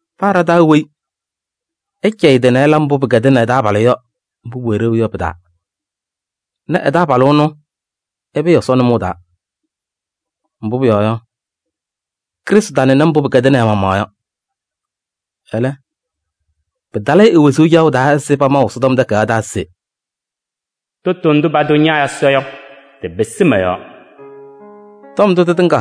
Paa ɖa-taa weyi, ɛcɛyɩ ɛ-tɩ nɛ ɛla mbʋ pɩkɛdɩnɩ ɛ-taabalʋ yɔ, mbʋ pʋwɛ ɖeu yɔ pɩ-taa nɛ ɛ-taabalʋ ɛnʋ, ɛpɩɩ Ɛsɔ nʋmɔʋ taa. Mbʋ pʋyɔɔ yɔ, Krɩstʋ tanɩnɩ mbʋ pɩkɛdɩnɩ ɛ-maɣmaɣ yɔ. Ɛlɛ, pɩtalɩ-ɩ e-wezuu caɣʋ taa ɛzɩ pamaʋ Ɛsɔtɔm Takayaɣ taa se: “Tʋtʋ ndʋ patʋ ña Ɛsɔ yɔ, tɩpɩsɩ mɔ-yɔɔ” yɔ. Tɔm ndʋ tɩtɩŋa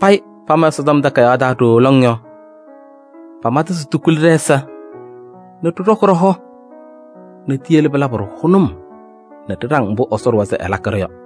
payɩ pama Ɛsɔtɔm Takayaɣ taa ɖooo lɔŋ yɔ, pama-tʋ se tikuli ɖɛ-ɛza nɛ ɖɩɖɔkɩ ɖɔ-hɔ nɛ tiyele pɩlabɩ-ɖʋ hʋnʋm nɛ ɖɩɖaŋ mbʋ Ɛsɔ ɖʋwa se ɛlakɩ yɔ.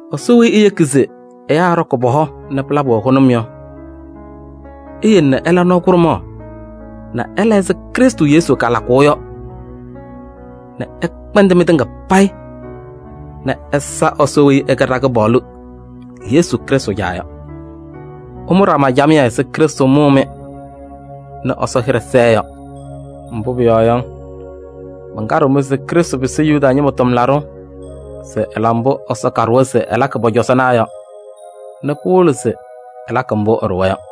Ɛsɔ weyi eyeki se ɛyaa ɛɖɔkɩ pɔ-hɔ nɛ pɩlabɩ-wɛ hʋnʋm yɔ, eyele nɛ ɩla nɔɔ kʋɖʋmaɣ nɛ ɩla ɛzɩ Krɩstʋ Yesu kalakʋʋ yɔ nɛ ɩkpɛndɩ mɩtɩŋa payɩ nɛ ɩsa Ɛsɔ weyi ɛkɛ ɖa-Kɩpaɣlʋ Yesu Krɩstʋ Caa yɔ. Ɩmʋ ɖama camɩyɛ ɛzɩ Krɩstʋ mʋʋ-mɩ nɛ Ɛsɔ hɩɖɛ sɛɛ yɔ. Mbʋ pʋyɔɔ yɔ, mankaɖɩɣ-mɩ se Krɩstʋ pɩsɩ Yuda ñɩma tʋmlaɖʋ se ɛla mbʋ Ɛsɔ kaɖʋwa se ɛlakɩ pɔ-cɔzɔnaa yɔ nɛ pɩwɩlɩ se ɛlakɩ mbʋ ɛɖʋwa yɔ.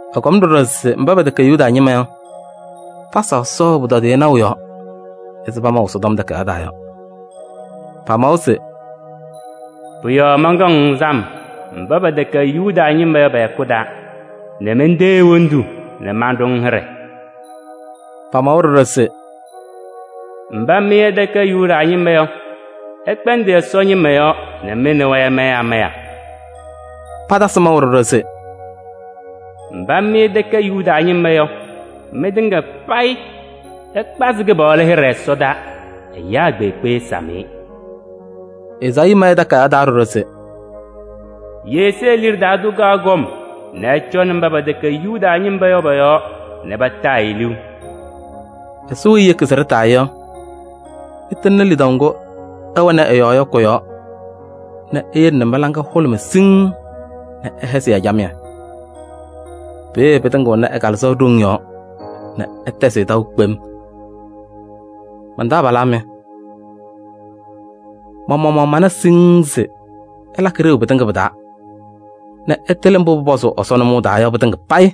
Ɛkɔm ɖɔɖɔ se mba pɛtɛkɛ Yuda ñɩma yɔ, pasa Ɛsɔ ɛ-pʋtɔdɩyɛ naʋ yɔɔ ɛzɩ pamaʋ Ɛsɔtɔm Takayaɣ taa yɔ. Pamawa se: “Pʋ-yɔɔ mankaɣ-ŋ sam mba pɛtɛkɛ Yuda ñɩma yɔ pɛ-hɛkʋ taa nɛ mentee hendu nɛ manɖʋ-ŋ hɩɖɛ.” Pamawa ɖɔɖɔ se: “Mba mɩ ɩtɛkɛ Yuda ñɩma yɔ, ɩkpɛndɩ Ɛsɔ ñɩma yɔɔ nɛ mɩ nɛ wɛ ɩmayɩ amaya.” Patasɩ maʋ ɖɔɖɔ se: “Mba mɩ ɩtɛkɛ Yuda ñɩma yɔ, mɩtɩŋa payɩ ɩkpazɩ Kɩpaɣlʋ hɩɖɛ ɛsɔdaa. Ɛyaa kpeekpe ɛsam-ɩ!” Ezaayii ma ɛ-takayaɣ taa ɖɔɖɔ se: “Yesee liɖe taa tʋ kaɣ kɔm nɛ ɛcɔnɩ mba pɛtɛkɛ Yuda ñɩma yɔ pɔ-yɔɔ nɛ pataa-ɩ liu.” Ɛsɔ weyi eyeki se ɖɩtaa-ɩ yɔ, ɛtɩŋnɩ lidaʋ ŋgʋ ɩwɛnɩ ɛ-yɔɔ yɔ kʋ-yɔɔ nɛ eyele mɩ-laŋa hʋlʋmɩ siŋŋ nɛ ɛhɛzɩ-yɛ camɩyɛ. Peeye pɩtɩŋɩɣnɩ ɛ-Kalɩzaɣ ɖoŋ yɔɔ nɛ ɩtɛzɩ-ɩ taʋ kpem. Man-taabalaa mɩ, ma-maɣmaɣ mana siŋŋ se ɩlakɩ ɖeu pɩtɩŋa pɩ-taa nɛ ɩtɩlɩ mbʋ pʋpɔzʋʋ Ɛsɔ nʋmɔʋ taa yɔ pɩtɩŋa payɩ.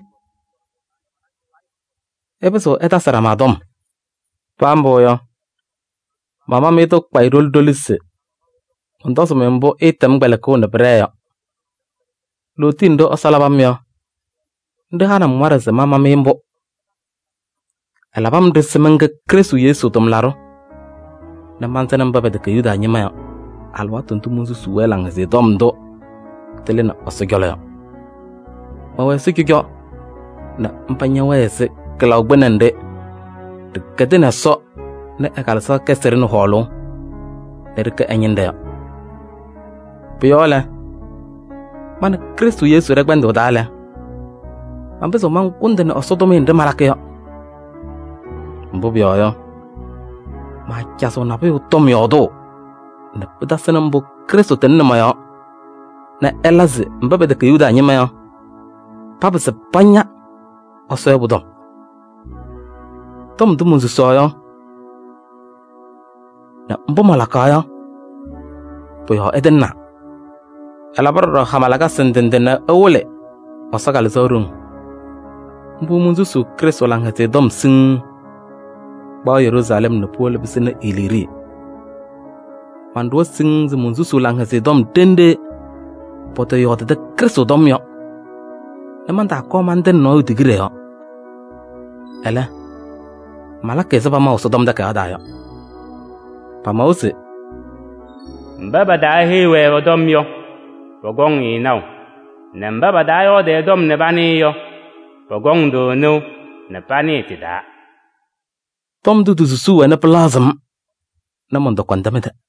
Ɩpɩzɩɣ ɩtasɩ ɖama tɔm. Paa mbʋ yɔ, mama-mɩ-tʋ kpayɩ ɖoli ɖoli se mɔntɔzɩ-mɩ mbʋ ɩɩtɛm kpɛlɩkʋʋ nɛ pɩɖɛɛ yɔ. Lootiye nɖɩ Ɛsɔ labɩ-m yɔ, nɖɩ hanɩ-m waɖɛ se mama-mɩ mbʋ. Ɛlabɩ-m-ɖɩ se mɛnkɛ Krɩstʋ Yesu tʋmlaɖʋ nɛ mansɩnɩ mba pɛtɛkɛ Yuda ñɩma yɔ alɩwaatʋ ndʋ monsusuu-wɛ Laŋhɛzɩyɛ Tɔm ndʋ tɩlɩnɩ Ɛsɔ ɛnʋ ɛ-cɔlɔ yɔ, mɛwɛ ɛzɩ cɔjɔ nɛ mba ñɛwɛɛ ɛzɩ kɩlaʋ kpɩnɛ nɖɩ ɖɩkɛdɩnɩ Ɛsɔ nɛ ɛ-Kalɩzaɣ kɛzɩ-ɖɩ nɛ hɔɔlʋʋ nɛ ɖɩkɛ ɛ-ñɩnɖɛ yɔ. Pʋ-yɔɔ lɛ, ma nɛ Krɩstʋ Yesu ɖɛ-kpɛndʋʋ taa lɛ, manpɩzɩɣ mankʋndɩnɩ Ɛsɔ tʋmɩyɛ nɖɩ malakɩ yɔ. Mbʋ pʋyɔɔ yɔ, maacazɩɣ nabʋyʋ tɔm yɔɔdʋʋ nɛ pɩtasɩnɩ mbʋ Krɩstʋ tɩŋnɩ mɔ-yɔɔ nɛ ɛla se mba pɛtɛkɛ Yuda ñɩma yɔ, papɩzɩ paña Ɛsɔ yɔ pʋ-tɔm. Tɔm ndʋ monsusaɣ yɔ nɛ mbʋ malakaɣ yɔ, pʋ-yɔɔ ɛtɩŋnaa. Ɛlabɩ ɖɔɖɔ hama lakasɩ ndɩ ndɩ nɛ ɛwɩlɩ Ɛsɔ Kalɩzaɣ ɖoŋ. Mbʋ monsusi Krɩstʋ Laŋhɛzɩyɛ Tɔm siŋŋ, kpaɣ Yeruusalɛm nɛ puwolo pɩsɩnɩ Iliirii. Manɖʋwa siŋŋ se monsusuu Laŋhɛzɩyɛ Tɔm ɖenɖe pɔtɔyɔɔdɩdɩ Krɩstʋ tɔm yɔ nɛ mantaakɔɔ mantɩnɩ nɔɔyʋ tigiɖe yɔɔ. Ɛlɛ, malakɩ ɛzɩ pamaʋ Ɛsɔtɔm Takayaɣ taa yɔ. Pamawa se: “Mba pataaheyi-wɛ ɛ-tɔm yɔ, pɔkɔŋ-ɩ naʋ, nɛ mba pataayɔɔdɩ ɛ-tɔm nɛ panɩɩ yɔ, pɔkɔŋ-tʋ nɩʋ nɛ panɩɩ tɩ-taa.” Tɔm ndʋ ti-susuu wɛna pɩlaɣzɩɣ-m nɛ mɔntɔkɔmdɩ mɩ-tɛ.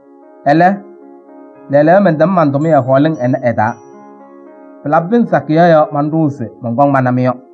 Ɛlɛ, lɛɛlɛɛyɔ mɛntɛm man-tʋmɩyɛ hɔɔlɩŋ ɩnɛ ɩ-taa. Pɩlabɩ pɩnzɩ sakɩyɛ yɔ, manɖʋʋ se mɔnkɔŋ mana-mɩ yɔ.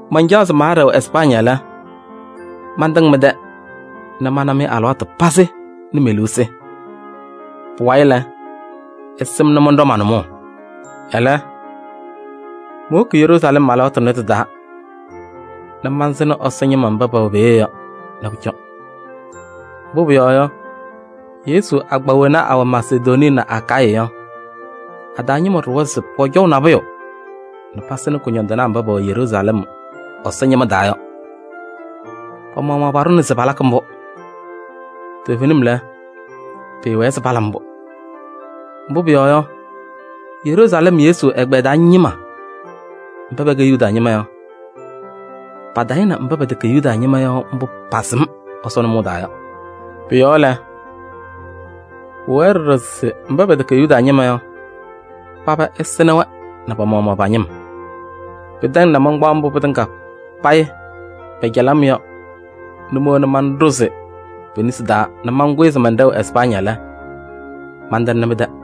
Mancaɣ se maaɖɛɣ Ɛspaañɩ lɛ, mantɩŋ mɩ-tɛ nɛ mana-mɩ alɩwaatʋ pazɩ nɛ me-liu sɩ. Pʋwayɩ lɛ, ɩsɩnɩ-m nɛ mɔnɖɔ ma-nʋmɔʋ. Ɛlɛ, mowoki Yeruusalɛm alɩwaatʋ tʋnɛ tɩ-taa nɛ mansɩnɩ Ɛsɔ ñɩma mba pɛwɛ peeye yɔ nɛ pʋcɔ. Mbʋ pʋyɔɔ yɔ, Yesu agbaa wena awɛ Masedonii nɛ Akayɩ yɔ, a-taa ñɩma ɖʋwa se pɔcɔʋ nabʋyʋ nɛ pasɩnɩ kʋñɔndɩnaa mba pɛwɛ Yeruusalɛm Ɛsɔ ñɩma taa yɔ. Pa-maɣmaɣ paɖʋna se palakɩ mbʋ. Toovenim lɛ, pɩɩwɛɛ se pala mbʋ. Mbʋ pʋyɔɔ yɔ, Yeruusalɛm Yesu ɛgbɛyɛ taa ñɩma mba pɛkɛ Yuda ñɩma yɔ, patayɩnɩ mba pɛtɛkɛ Yuda ñɩma yɔ mbʋ pasɩm Ɛsɔ nʋmɔʋ taa yɔ. Pʋ-yɔɔ lɛ, pʋwɛɛ ɖɔɖɔ se mba pɛtɛkɛ Yuda ñɩma yɔ, paba ɛsɩnɩ-wɛ nɛ pa-maɣmaɣ pa-ñɩm. Pɩtɛŋ nɛ mankpaɣ mbʋ pɩtɩŋa payɩ pɛcɛlɩ-m yɔ nɛ mowona manɖʋzɩ pe-nesi taa nɛ mankʋyɩ se mɛnɖɛɣ Ɛspaañɩ lɛ, mantɩŋnɩ mɩ-tɛ.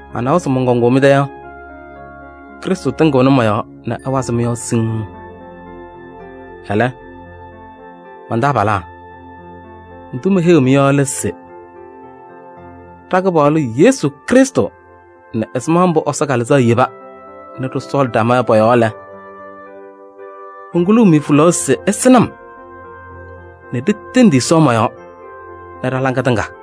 Manawa se mɔnkɔŋʋʋ mɩ-tɛ yɔ, Krɩstʋ tɩŋɩɣnɩ mɔ-yɔɔ nɛ ɛwazɩ mɩ-yɔɔ siŋŋ. Ɛlɛ, man-taabalaa, ndʋ meheyiɣ-mɩ yɔ lɛ se ɖa-Kɩpaɣlʋ Yesu Krɩstʋ nɛ ɛzɩma mbʋ Ɛsɔ Kalɩzaɣ yeba nɛ ɖɩsɔɔlɩ ɖama yɔ pɔ-yɔɔ lɛ, monkuluu-mɩ hulaɣ se ɩsɩnɩ-m nɛ ɖitendi Ɛsɔ mɔ-yɔɔ nɛ ɖa-laŋa tɩŋa.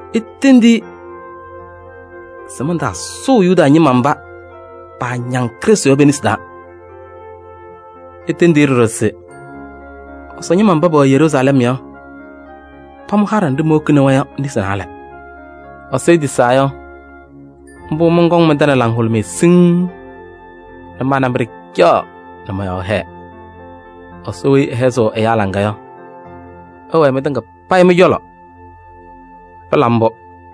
Itendi-i se mantaasʋʋ Yudee ñɩma mba paañaŋ Krɩstʋ yɔ pe-nesi taa. Itendi-i ɖɔɖɔ se Ɛsɔ ñɩma mba pɛwɛ Yeruusalɛm yɔ, pamʋ haɖɛ nɖɩ mowokini-wɛ yɔ nesi naalɛ. Ɛsɔ etisaa yɔ, mbʋ mɔnkɔŋ mɩ-tɛ nɛ laŋhʋlʋmɩyɛ siŋŋ nɛ ma nɛ mɩ ɖɩcaɣ nɛ mɔ-yɔɔ hɛɛ. Ɛsɔ weyi ɛhɛzɩɣ ɛyaa laŋa yɔ, ɛwɛɛ mɩtɩŋa payɩ mɩ-cɔlɔ. Pɩla mbʋ!